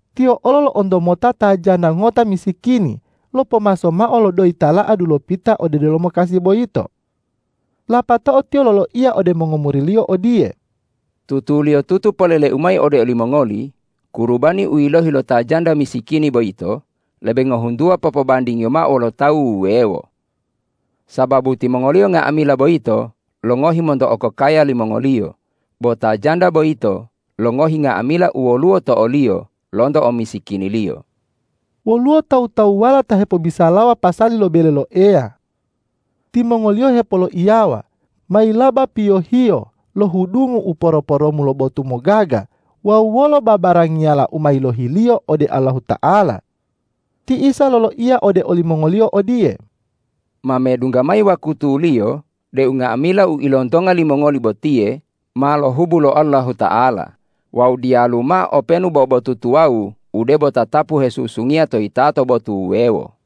Tiyo olo lo'onto mota ta janda ngota misikini lopomaso mao lo doyi tala'a dulopita ode delomo kasi boyito. Lapatao Tiyo loloiya ode mongomuri-Liyo odiye,”Tutuliyotutu polele-U mayi ode olimongoli: Kurubani u yilohi lo ta janda misikini boyito lebe ngohuntuwa popobandingiyo mao wolo tawu wuwewo. Sababu timongoliyo nga'amila boyito longohi monto okokaya limongoliyo, bo ta janda boyito longohi nga'amila u woluwo to oliyo lonto omisikiniliyo.” Woluwo tawu-tawuwala ta hepobisalawa pasali lo bele lo Eya. Timongoliyo hepoloiyawa, mayilaba piyohiyo lo hudungu u poro-poromu lo botu mogaga wawu wolo babarangiyala u ma yilohiliyo ode Allahuta'ala. Ti Isa loloiya ode olimongoliyo odiye, ”Ma medungga mayi wakutuliyo deu nga'amila u ilontonga limongoli botiye ma lohubu lo Allahuta'ala wawu diyalu mao openu bo botu tuwawu u debo tatapu hesusungiya to yitato botu wuwewo!”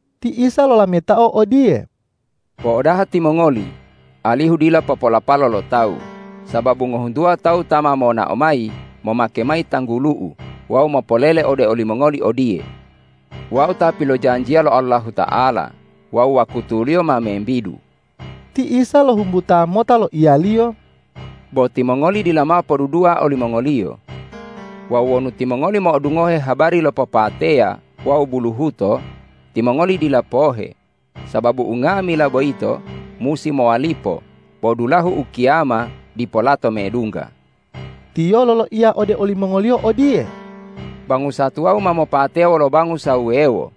Ti Isa lolametao odiye,”Po'odaha timongoli alihu dila popolapalo lo tawu. Sababu ngohuntuwa tawu ta ma monao mayi momake mayi tanggulu-U wawu mopolele ode olimongoli odiye, ’Wau ta pilojanjiya lo Allahuta'ala wawu wakutuliyo ma membidu.’” Ti Isa lohumbuta mota loiya-Liyo,”Bo timongoli dila mao podudua olimongoliyo. Wawu wonu timongoli mo'odungohe habari lo popateya wawu buluhuto, timongoli dila pohe, sababu unga'amila boyito musi mowalipo bo dulahu ukiyama dipo lato medungga.” Tiyo loloiya ode olimongoliyo odiye,”Bangusa tuwawu ma mopateya wolo bangusa wuwewo.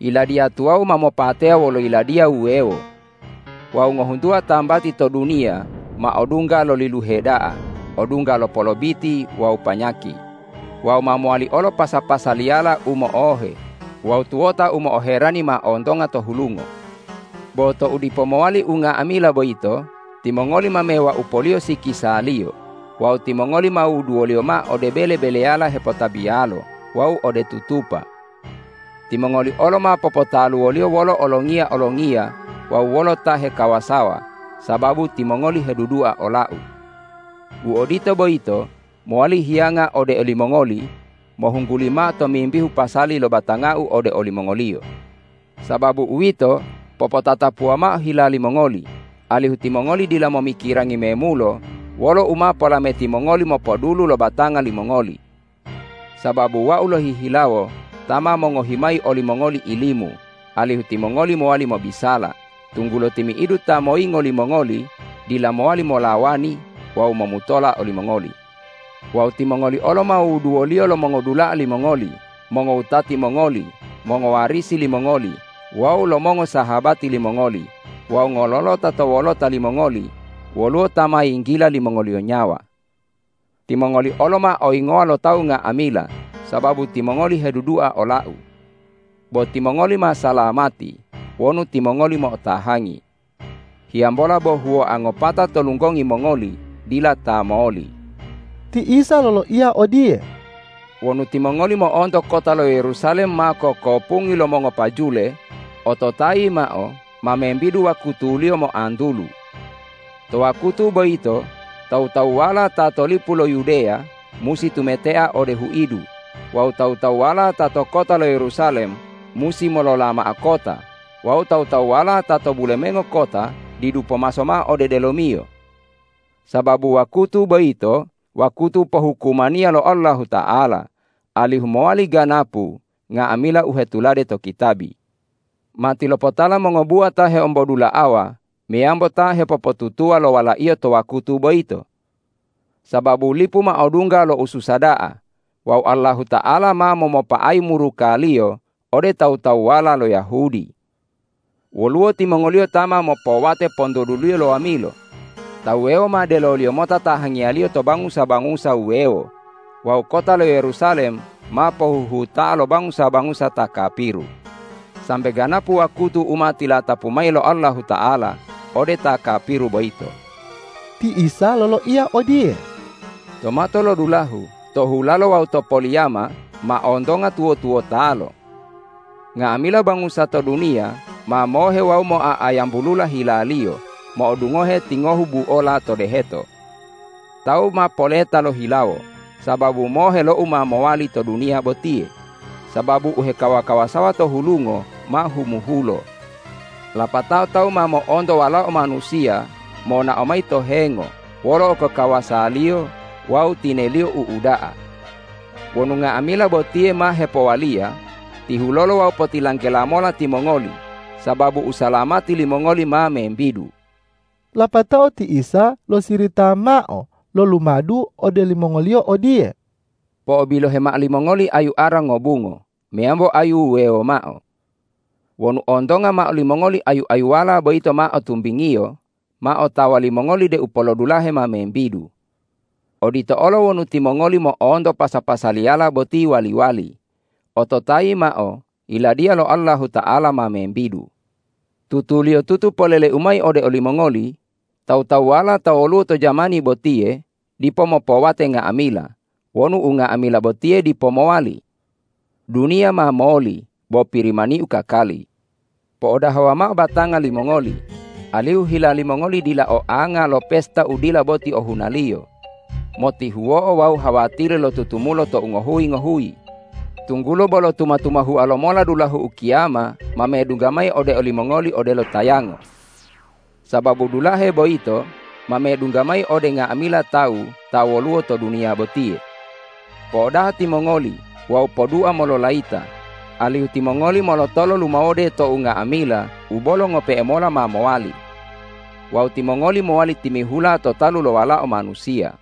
Yiladiya tuwawu ma mopateya wolo yiladiya wuwewo. Wawu ngohuntuwa tambati to duniya ma odungga lo liluhe da'a, odungga lo polobiti wawu panyaki, wawu ma mowali olo pasa-pasaliyala u mo'ohe wawu tuwota u mo'oherani ma ontonga to hulungo. Bo tou dipo mowali unga'amila boyito, timongoli ma mewaupoliyo sikisaliyo wawu timongoli ma wuduwoliyo mao ode bele-beleyala hepotabiyalo wawu ode tutupa. Timongoli olo ma popotaluwoliyo wolo olongiya-olongiya wawu wolo ta hekawasawa sababu timongoli hedudua ola-U. U odito boyito mowali hiyanga ode olimongoli mohungguli mao tomimbihu pasali lo batanga-U ode olimongoliyo. Sababu uwito, popotatapuwa mao hila limongoli, alihu timongoli dila momikirangi memulo wolo u ma polameti mongoli mopodulu lo batanga limongoli. Sababu Wau lohihilawo ta ma mongohi mayi olimongoli ilimu, alihu timongoli mowali mobisala, tunggulo timi'idu ta moyingo limongoli dila mowali molawani wawu momutola olimongoli. Wawu timongoli olo ma wuduwoliyo lo mongodula'a limongoli, mongowutati mongoli, mongowarisi limongoli wawu lo mongosahabati limongoli wawu ngololota to wolota limongoli woluwo ta ma yinggila limongoliyo nyawa. Timongoli olo ma oyingowa lo tawu nga'amila sababu timongoli hedudua ola-U. Bo timongoli ma salamati wonu timongoli mo'otahangi. Hiyambola bo huwoa ngopata to lunggongi mongoli dila ta moli.” Ti Isa loloiya odiye,”Wonu timongoli mo'onto kota lo Yerusalem ma kokopungi lo mongopajule, ototayi mao: Ma membidu wakutuliyo moantulu. To wakutu boyito tawu-tawuwala ta to lipu lo Yudeya musi tumetea ode huidu, wawu tawu-tawuwala ta to kota lo Yerusalem musi molola mao kota wawu tawu-tawuwala ta to bulemengo kota didu pomaso mao ode delomiyo. Sababu wakutu boyito wakutu pohukumaniya lo Allahuta'ala, alihu mowali ganapu nga'amila u hetulade to kitabi. Matilopotala mongobuwa ta heombodula'awa meyambo ta hepopotutuwa lo walaiyo to wakutu boyito! Sababu lipu ma odungga lo ususa da'a wawu Allahuta'ala ma momopa'ayi muruka-Liyo ode tawu-tawuwala lo Yahudi. Woluwo timongoliyo ta ma mopowate pontoduliyo lo wamilo, ta wuwewo ma deloliyo mota tahangiyaliyo to bangusa-bangusa wuwewo wawu kota lo Yerusalem ma pohuhuta'a lo bangusa-bangusa ta kapiru, sambe ganapu wakutu u ma tilatapu mayi lo Allahuta'ala ode ta kapiru boyito.” Ti Isa loloiya odiye,”To matolodulahu, to hulalo wawu to poliyama ma ontonga tuwo-tuwotalo. Nga'amila bangusa to duniya ma mohe wawu moa'ayambulula hilaliyo mo'odungohe tingohu buola to deheto. Tawu ma poleta lohilawo sababu mohe lo u ma mowali to duniya botiye, sababu u hekawa-kawasawa to hulungo ma humuhulo. Lapatao tawu ma mo'onto Walao Manusiya monao mayi to hengo wolo okokawasa-Liyo wawu tine-Liyo u uda'a. Wonu nga'amila botiye ma hepowaliya, tihulolo wawu potilanggela mola timongoli, sababu usalamati limongoli ma membidu.” Lapatao ti Isa losirita mao lo lumadu ode olimongoliyo odiye,”Po'obilohe mao limongoli ayu ara ngobungo meyambo ayu wuwewo mao. Wonu ontonga mao limongoli ayu-ayuwala boyito ma o tumbingiyo, ma otawa limongoli deu polodulahe ma membidu. Odito olo wonu timongoli mo'onto pasa-pasaliyala boti wali-wali, ototayi mao: Yiladiya lo Allahuta'ala ma membidu. Tutuliyotutu polele-U mayi ode olimongoli: Tawu-tawuwala ta woluwo to jamani botiye dipo mopowate nga'amila wonu unga'amila botiye dipo mowali. Duniya ma moli, bo Pirimani-U kakali.” ”Po'odahawa mao batanga limongoli, alihu hila limongoli dila oanga lo pesta u dila boti ohunaliyo, motihuwo'o wawu hawatiri lo tutumulo tou ngohuyi-ngohuyi, tunggulo bolo tuma-tumahua lomola dulahu ukiyama ma medungga mayi ode olimongoli odelo tayango. Sababu dulahe boyito ma medungga mayi ode nga'amila tawu ta woluwo to duniya botiye. Po'odaha timongoli wawu podua mololayita, alihu timongoli molotolo lumawode to unga'amila u bolo ngope'e mola ma mowali. Wawu timongoli mowali timihula to talu lo Walao Manusiya.”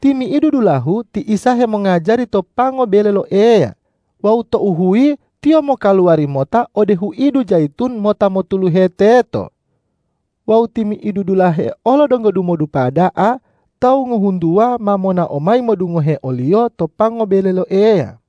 Timi'idu dulahu ti Isa hemongajari to pango bele lo Eya wawu tou huyi tiyo mokaluwari mota ode huidu Jayitun mota motuluhe teto. Wawu timi'idu dulahe olo donggo dumodupa da'a tawu ngohuntuwa ma monao mayi modungohe o-Liyo to pango bele lo Eya.